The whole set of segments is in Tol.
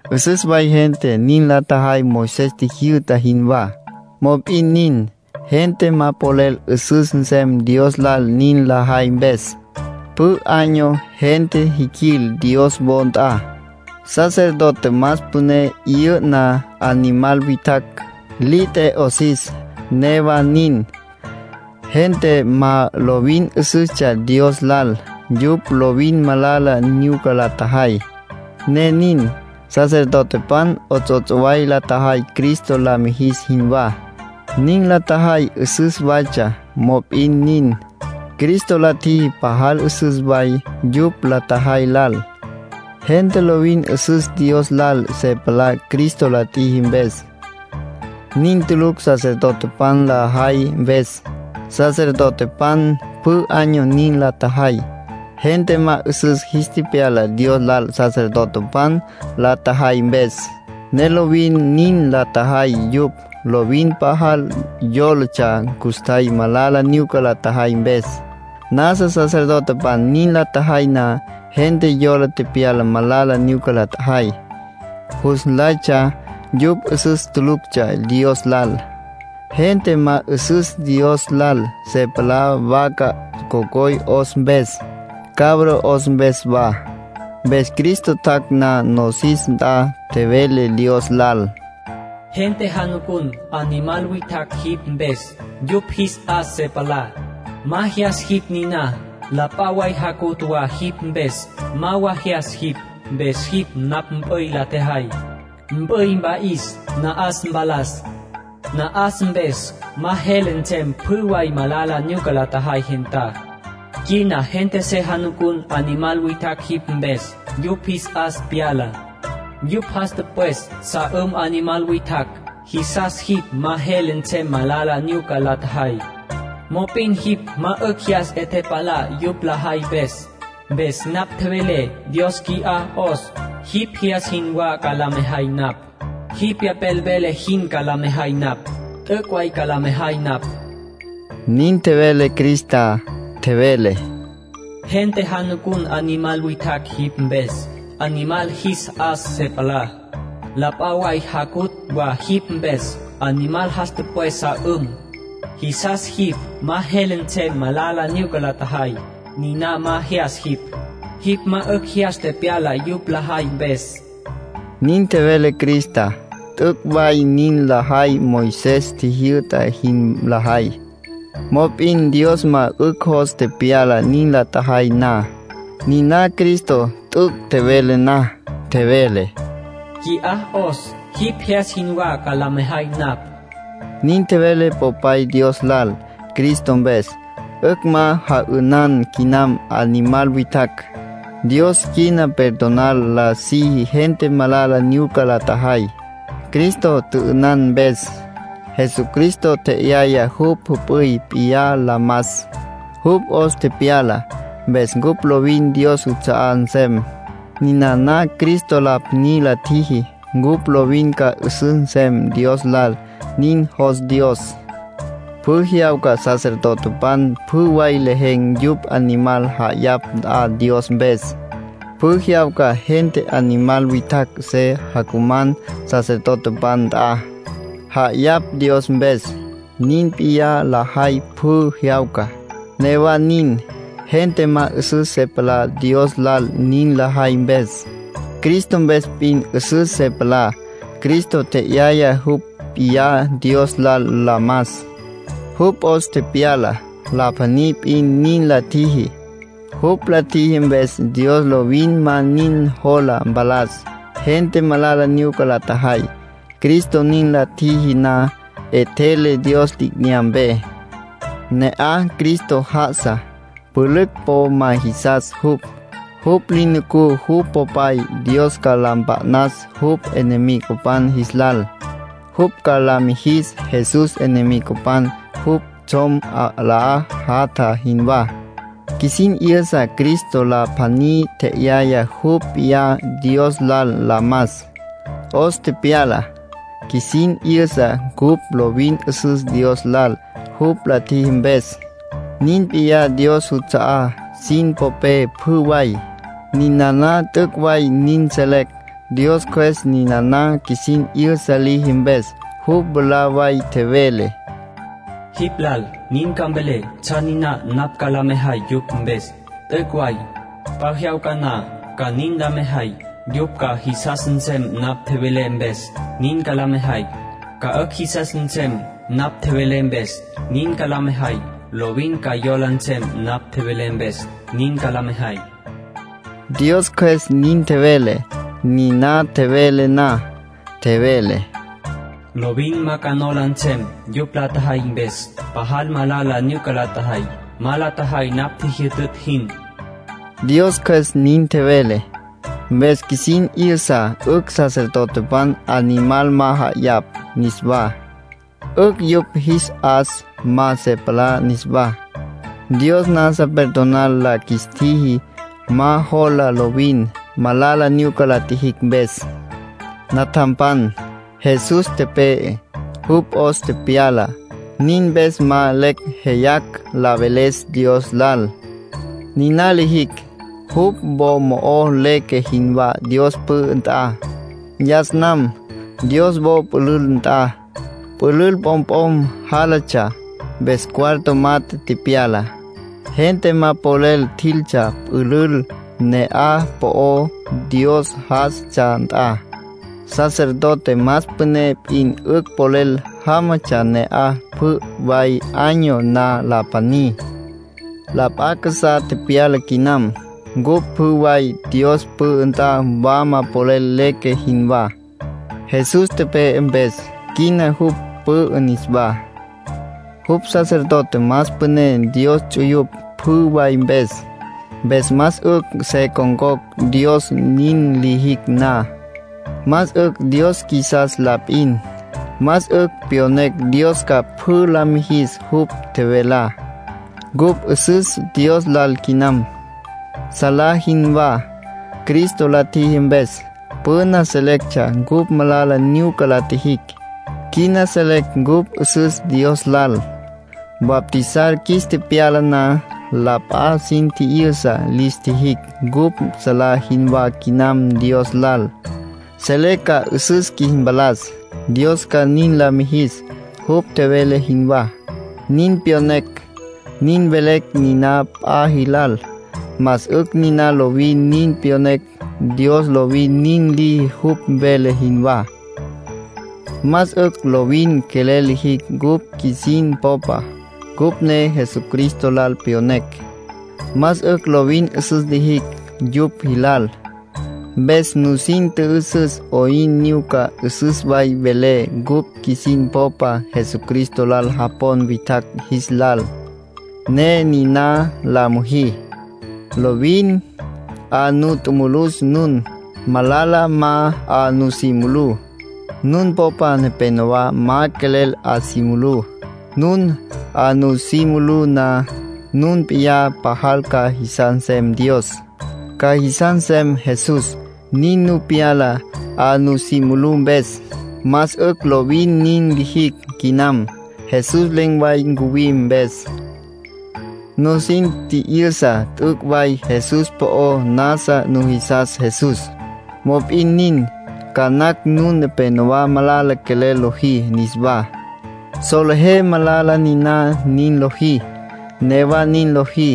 'Üsüs way gente nin la tjajay Moisés tjijyü'ta jinwá. Mop'in nin, gente ma polel 'üsüs nsem Dios lal nin lajay mpes. Pjü año gente jiquil Dios wo nt'a. Sacerdote más püné 'yü'na animal witjacj, li t'e 'osis. Newa nin, gente ma lovin 'üsüstsja Dios lal; yupj lovin malala nyuca la tjajay, ne nin. Sacerdotepan 'ots'ots' way la tjajay Cristo la mijis jinwá. Nin la tjajay 'üsüs waytsja; mop'in nin, Cristo la tjiji pajal 'üsüs way yupj la tjajay lal. Gente lovin 'üsüs Dios lal se palá Cristo la tjiji mpes. Nin tulucj sacerdotepan la jay mpes. Sacerdotepan pjü año nin la tjajay. Gente ma 'üsüs jis tepyala Dios lal sacerdotepan la tjajay mpes, ne lovin nin la tjajay yupj. Lovin pajal yólatsja custjay malala nyuca la tjajay mpes. Nasa sacerdotepan nin la tjajay na, gente yola tepyala malala nyuca la tjajay. Jus nlaytsja yupj 'üsüs tuluctsja Dios lal. Gente ma 'üsüs Dios lal se palá, vaca cocoy 'os mpes, cabro 'os mpes wa. Mpes Cristo tjac' na nosis nt'a, tjevele Dios lal: “Gente jacuman animal witjacj jipj mpes, yupj jis 'as se palá. Ma jyas jipj niná. La p'a way jacutj wa jipj mpes. Ma wa jyas jipj. Mpes jipj napj mp'üy la tjejay. Mp'üy mpa'is, na'as mpalas. Na'as mpes ma jele nsem pjü way malala nyuca la tjajay gentá. Quina gente se jacuman animal witjacj jipj mpes, yupj jis 'as pyala, yupj jas tüpwes sa 'üm animal witjacj. Jisas jipj ma jele nsem malala nyuca la tjajay. Mop'in jipj ma 'ücj jyas 'e tepalá yupj lajay mpes. Mpes napj tjevelé: ‘Dios, qui'á 'os. Jipj jyas jinwá ca la mejay napj. Jipj Pyapel vele jin ca la mejay napj. T'üc' way ca la mejay napj.’” Nin tjevele Cristá. Tjevele: “Gente jacuman animal witjacj jipj mpes, animal jis 'as se palá. La p'a way jacutj wa jipj mpes. Animal jas tüpwes sa 'üm, jisas jipj ma jele nsem malala nyuca la tjajay. Niná ma jyas jipj. Jipj ma 'ücj jyas tepyala yupj lajay mpes.” Nin tjevele Cristá. T'üc' way nin lajay Moisés tjijyü'ta jin lajay, mop'in Dios ma 'ücj jos tepyala nin la tjajay na. Niná Cristo t'üc' tjevele na, tjevele: “Qui'á 'os. Jipj jyas jinwá ca la mejay napj”, nin tjevele Popay Dios lal. Cristo mpes, 'ücj ma ja'ünan quinam animal witjacj. Dios quina perdonar la siji gente malala nyuca la tjajay, Cristo tjü'ünan mpes. Jesucristo tje'yaya jupj jüp'üy p'iyá la mas, jupj 'os tepyala, mpes cupj lovin Dios juts'a'á nsem. Ninana Cristo la pjaní la tjiji, cupj lovin ca 'üsüs nsem Dios lal. Nin jos Dios. Pjü jyawca sacerdotepan pjü way lejen̈ yupj animal ja'ayapj nt'a Dios mpes. Pjü jyawca gente animal witjacj se jacuman sacerdotepan nt'a, ja'ayapj Dios mpes. Nin p'iyá lajay pjü jyawca. Newa nin, gente ma 'üsüs se palá Dios lal nin lajay mpes. Cristo mpes p'in 'üsüs se palá. Cristo tje'yaya jupj p'iyá Dios lal la mas, jupj 'os tepyala. La pjaní p'in nin la tjiji. Jupj la tjiji mpes Dios lovin ma nin jola mpalas gente malala nyuca la tjajay. Cristo nin la tjiji na, 'etjele Dios li'inyampe. Ne'aj Cristo já'asa. Pülücj po ma jisas jupj. Jupj li nucú jupj Popay Dios ca la mpa'nas jupj enemigopan jis lal. Jupj ca la mijis Jesús enemigopan jupj tsjom 'alá jatja jinwá. Qjuisin 'yüsa Cristo la pjaní tje'yaya jupj p'iyá Dios lal la mas, 'os tepyala. Qjuisin 'yüsa cupj lovin 'üsüs Dios lal, jupj la tjiji mpes. Nin p'iyá Dios juts'a'á sin popé pjü way. Ninana t'üc' way nin selecj, Dios Cjües ninana qjuisin 'yüsa liji mpes. Jupj mwalá way tjevele: “Jipj lal nin ca mvelé tsjan niná napj ca la mejay yupj mpes. T'üc' way, p'a jyawca na ca nin la mejay. Yupj ca jisas nsem napj tjevelé mpes, nin ca la mejay. Ca 'ücj jisas nsem napj tjevelé mpes, nin ca la mejay. Lovin ca yola nsem napj tjevelé mpes, nin ca la mejay.” Dios Cjües nin tjevele. Niná tjevele na, tjevele: “Lovin ma ca nola nsem yupj la tjajay mpes. Pajal malala nyuca la tjajay, ma la tjajay napj tjijyütütj jin.” Dios Cjües nin tjevele. Mpes qjuisin 'yüsa 'ücj sacerdotepan animal ma ja'ayapj niswá. 'Ücj yupj jis 'as ma se palá niswá; Dios nasa perdonar la qjuis tjiji, ma jola lovin, malala nyuca la tjijicj mpes. Natjampan, Jesús tepe'e, jupj 'os tepyala. Nin mpes ma lecj jeyacj la veles Dios lal. Niná lijicj, jupj wo mo'ó leque jinwá Dios pü'ü nt'a. Yas nam, Dios wo pülül nt'a, pülül p'omp'om jálatsja, mpes cuarto mat'e tepyala. Gente ma polel tjiltsja pülül na'aj po'ó Dios já'asatsja nt'a. Sacerdote más püné p'in 'ücj polel jámatsja ne'aj pjü way año na la pjaní. La p'a casá tepyala quinam. Cupj pjü way Dios pü'ü nt'a wama polel leque jinwá, Jesús tepe'e mpes. Quina jupj pü'ü niswá. Jupj sacerdote más püné Dios ts'uyupj pjü way mpes. Mpes más 'ücj se con̈cocj Dios. Nin lijicj na, más 'ücj Dios qjuisas la p'in. Más 'ücj pyonecj Dios ca pjü la mijis jupj tjevelá. Cupj 'üsüs Dios lal quinam, salá jinwá, Cristo la tjiji mpes. Püna selectsja cupj malala nyuca la tjijicj; quina selecj cupj 'üsüs Dios lal. Bautizar qjuis tepyala na, la p'a sin tji'yüsa lis tjijicj cupj salá jinwá quinam Dios lal. Selecj ca 'üsüs qjuis mpalas, Dios ca nin la mijis, jupj tjevele jinwá. Nin pyonecj, nin velecj niná p'a jilal. Más 'ücj niná lovin nin pyonecj. Dios lovin nin liji jupj vele jinwá. Más 'ücj lovin quelel lijicj cupj qjuisin popa, cupj ne Jesucristo lal pyonecj. Más 'ücj lovin 'üsüs lijicj yupj jilal. Mpes nusin tjü'üsüs 'oyn nyuca 'üsüs way welé cupj qjuisin popa Jesucristo lal japon witjacj jis lal, ne niná la müjí. Lovin 'a nu tjumulus nun. Malala ma 'a nusí mulú. Nun popa nepénowa ma quelel 'a si mulú. Nun 'a nusí mulú na, nun p'iyá pajal ca jisas nsem Dios, ca jisas nsem Jesús; nin nu pyala 'a nusí mulú mpes. Más 'ücj lovin nin lijicj quinam, Jesús len̈ way ncuwim mpes. Nusin tji'yüsa t'üc' way Jesús po'ó; nasa nujisas Jesús. Mop'in nin, ca nacj nun nepénowa malala quelel lojí niswá. Solejé malala niná nin lojí, newa nin lojí.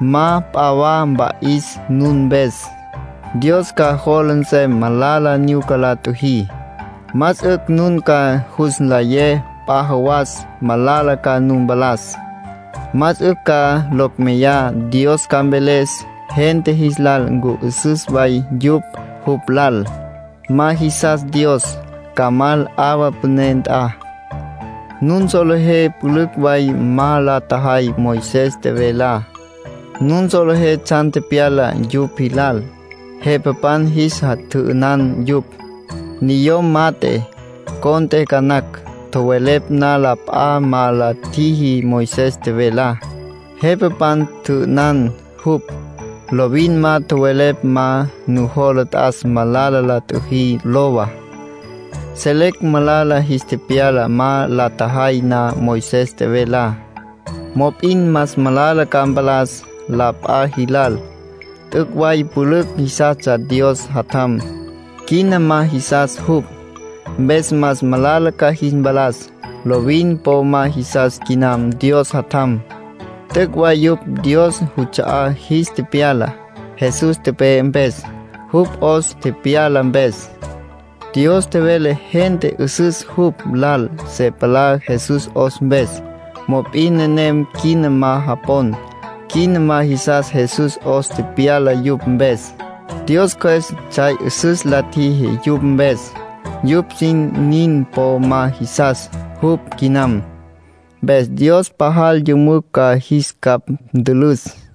Ma p'a wa mpa'is nun mpes. Dios ca jola nsem malala nyuca la tjüjí. Más 'ücj nun ca jus nlayé p'a jawas malala ca nu mpalas. Más 'ücj ca locj meyá Dios ca mveles gente jis lal ncu 'üsüs way yupj jupj lal. Ma jisas Dios, ca mal 'awa püné nt'a. Nun solejé pülücj way ma la tjajay Moisés tjevelá. Nun solejé tsjan tepyala yupj jilal. Jepapan jis tjü'ünan yupj. Niyom mat'e, cont'e ca nacj, tjowelepj na la p'a ma la tjiji Moisés tjevelá, jepapan tjü'ünan jupj. Lovin ma tjowelepj ma nujola t'as malala la tjüjí, lowa. Selecj malala jis tepyala ma la tjajay na Moisés tjevelá. Mop'in más malala ca mpalas la p'a jilal. T'üc' way pülücj jisastsja Dios Jatjam, quina ma jisas jupj. Mpes más malala ca jis mpalas. Lovin po ma jisas quinam Dios Jatjam. T'üc' way yupj Dios juts'a'á jis tepyala, Jesús tepe'e mpes, jupj 'os tepyala mpes. Dios tjevele gente 'üsüs jupj lal se palá Jesús 'os mpes. Mop'in nenem quina ma japon, quina ma jisas Jesús 'os tepyala yupj mpes. Dios Cjües tsjay 'üsüs la tjiji yupj mpes. Yupj sin nin po ma jisas jupj quinam. Mpes Dios pajal yümücj ca jis capj ntülüs.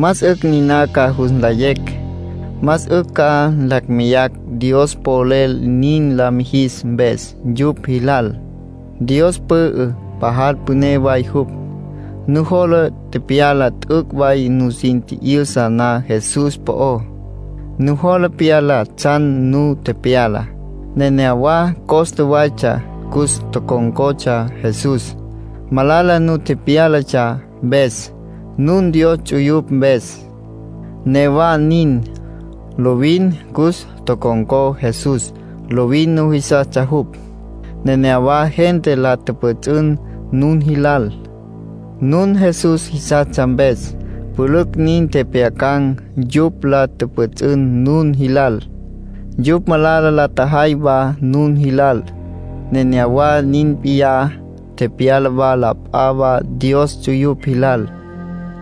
Más 'ücj niná ca jus nlayecj. Más 'ücj ca lacj meyacj Dios polel nin la mijis mpes yupj jilal. Dios pü'ü, pajal püné way jupj. Nujola pyala t'üc' way nusin tji'yüsa na Jesús po'ó. Nujola pyala tsjan nu tepyala. Nenéyawa costa waytsja cus tocon̈cotsja Jesús, malala nu tepyálatsja mpes, nun Dios ts'uyupj mpes. Newa nin, lovin cus tocon̈có Jesús, lovin nujisastsja jupj. Nenéyawa gente la tjüpjüts'ün nun jilal, nun Jesús jisastsja mpes. Pülücj nin tjepjyacan̈ yupj la tjüpjüts'ün nun jilal. Yupj malala la tjajay wa nun jilal. Nenéyawa nin p'iyá tepyala wa la p'a wa Dios ts'uyupj jilal.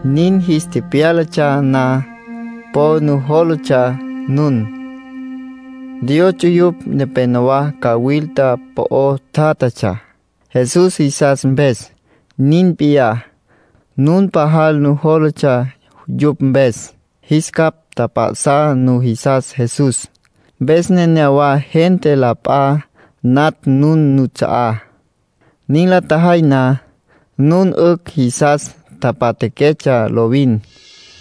Nin jis tepyálatsja na, po nujólatsja nun. Dios ts'uyupj nepenowá cawilta po'o tjátjatsja, Jesús jisas mpes. Nin p'iyá, nun pajal nujólatsja yupj mpes, jis capj tjap'a'sá. Nujisas Jesús, mpes nenéyawa gente la p'a natj nun nuts'a'á. Nin la tjajay na, nun 'ücj jisas tapatjaquetsja lovin;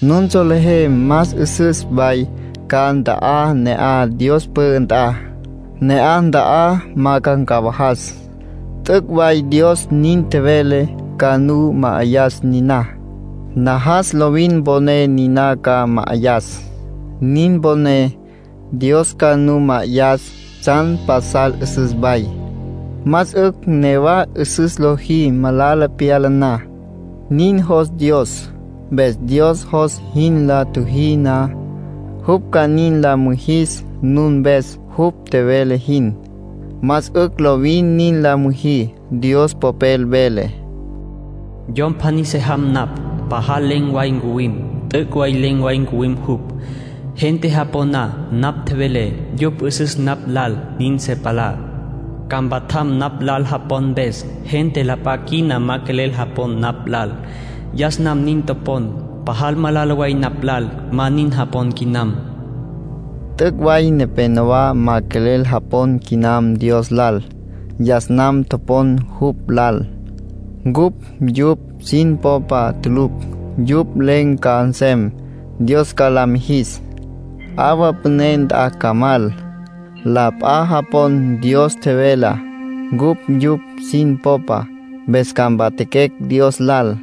nun solejé más 'üsüs way ca nta'á ne'aj Dios pü'ü nt'a. Ne'aj nta'á ma ca ncawajas. T'üc' way Dios nin tjevele ca nu ma'ayas niná. Najas lovin mponé niná ca ma'ayas. Nin poné, Dios ca nu ma'ayas tsjan pasal 'üsüs way. Más 'ücj newa 'üsüs lojí malala pyala na. Nin jos Dios. Mpes Dios jos jin la tjüjí na, jupj ca nin la mijis nun mpes jupj tjevele jin. Más 'ücj lovin nin la müjí. Dios Popel vele: “Yom pjaní se jam napj, pajal len̈ way ncuwim. T'üc' way len̈ way ncuwim jupj. Gente japon na napj tjevelé, yupj 'üsüs napj lal nin se palá. Ca mpatjam napj lal japon mpes. Gente la p'a quina ma quelel japon napj lal. Yas nam nin topon. Pajal malala way napj lal ma nin japon quinam.” Dios nin tjevele. T'üc' way nepénowa ma quelel japon quinam Dios lal. Yas nam topon jupj lal. Cupj yupj sin popa tulucj. Yupj len̈ ca nsem, Dios ca la mijis. 'Awa püné nt'a ca mal. La p'a japon Dios tjevelá. Cupj yupj sin popa, mpes ca mpatjaquecj Dios lal.